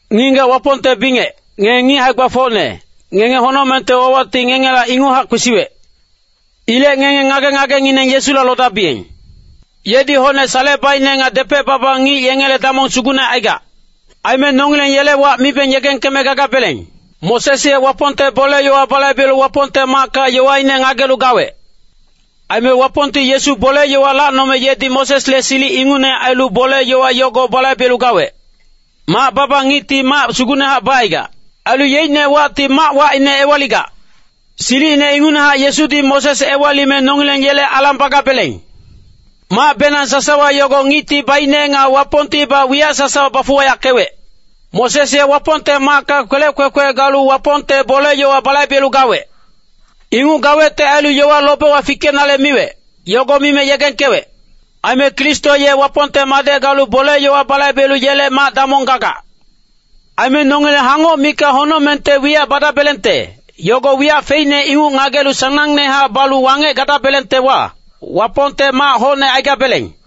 Ngic-ngigac Wapongte bingec, ngenge ngic hae-gbafocne, ngenge honocmengte wawacti ngengela inguchac kwesiwec. Ilec ngenge ngage-ngagengineng Yesula lodabiyeng. Yedi hocne salecebaicne nga depec-baba ngic yengele damong sugucne aigac. Aime nongileng yele wac mibeng yegengkeme gagabeleng. Moses ye Wapongte bole-yowa balaibelu Wapongte macka yowaine ngagelu gawec. Aime Wapongti Yesu bole-yowa lacnome yedi Mosesle silic ingucne ailu bole-yowa yogo balaibelu gawec. Mac-baba ngicti mac sugucnehac bacaigac. Ailu yeicne wacti mac wacine ewaligac. Silicine ingucnehac Yesudi Moses ewalime nongileng yele alang bagabeleng. Macbenang sasawa yogo ngicti baicne nga Wapongtibac wiyac sasawa bafuwayackewec. Moses ye Wapongte macka kwelec kwekwe galu Wapongte bole-yowa balaibelu gawec. Inguc gawecte ailu yowa lobewa fikenale miwec, yogo mime yegengkewec. Aime Kristo ye Wapongte Madec galu bole-yowa balaibelu yele mac-damong gagac. Aime nongileng hangoc mikac honocmengte wiyac badabelengte, yogo wiyac feicne inguc ngagelu sanangnehac balu wangec gadabelengtewa, Wapongte mac hocne aigabeleng.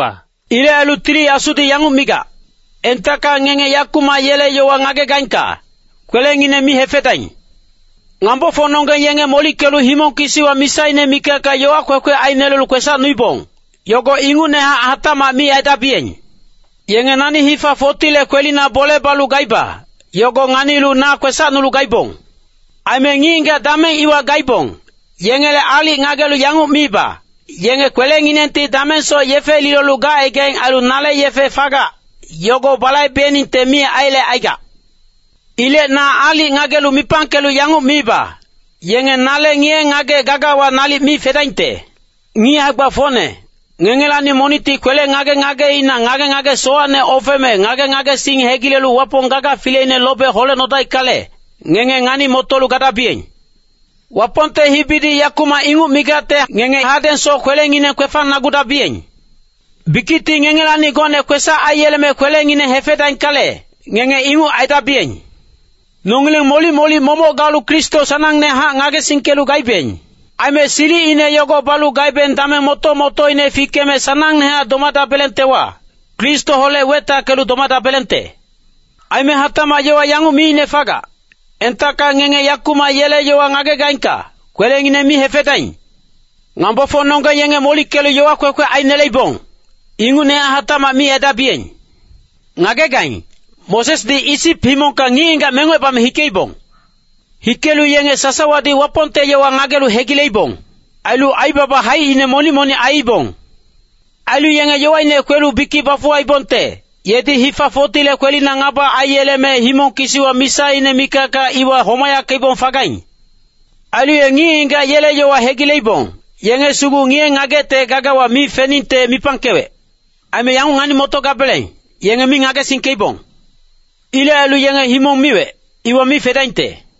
Ilec ailu Tili Asudi yanguc migac, “Entacka ngenge yakumac yele yowa ngagegaingka, kwelengineng mi hefedaing. Ngambofocnonggeng yenge molickelu himong kisiwa misaine mikacka yowa kwekwe ainelelu kwesacnuibong, yogo ingucnehac hatacmac mi aidabiyeng. Yenge nani hifa 40le kwelina bole balu gaiba, yogo nganilu na kwesacnulu gaibong. Aime ngic-ngigac dameng iwa gaibong, yengele aalic ngagelu yanguc miiba, ‘Yenge kwelenginengti damengsoc yefe lilolu gacaigaing ailu nale yefe fagac, yogo balaibeningte mi aiyelecaigac.’ Ilec na aalic ngagelu mipangkelu yanguc miiba, ‘Yenge nale ngiye-ngagec gagawa nalic mi fedaingte.’” Ngic hae-gbafocne, ngengelacni monicti kwele ngage-ngageina ngage-ngage sowacne ofeme ngage-ngagesing hegilelu Wapong gaga fileine lobe holecnodaickale, ngenge ngani-motolu gadabiyeng. Wapongte hibidi “yakumac” inguc migacte ngenge hadengsoc kwelengineng kwefangnagudabiyeng. Bikicti ngengelacni gocne kwesac aiyeleme kwelengineng hefedaingkale, ngenge inguc aidabiyeng. Nongileng molic-molic momoc galu Kristo sanangnehac ngagesingkelu gaibeng. Aime silicine yogo balu gabeng dameng moto-motoine fikeme sanangnehac domadabelengtewa, Kristoholec wetackelu domadabelengte. Aime hatacmac yowa yanguc miicne fagac, “Entacka ngenge yakumac yele yowa ngagegaingka, kwelengineng mi hefedaing. Ngambofocnonggeng yenge molickelu yowa kwekwe aineleibong, ingucnehac hatacmac mi aidabiyeng.” Ngagegaing, Mosesdi Isip himongkacni ngic-ngigac mengocebame hikeibong. Hikelu yenge sasawadi Wapongte yowa ngagelu hegileibong. Ailu aibaba haicine monic-monic aiibong. Ailu yenge yowaine kwelu bikic bafuwaibongte, yedi hifa 40le kwelina ngaba aiyeleme himong kisiwa misaine mikacka iwa homayackeibong fagaing. Ailu ye ngic-ngigac yele yowa hegileibong, yenge sugu ngiye-ngagecte gagawa mi feningte mipangkewec. Aime yanguc ngani-motogabeleng, yenge mi ngagesingkeibong. Ilec ailu yenge himong miwec, iwa mi fedaingte.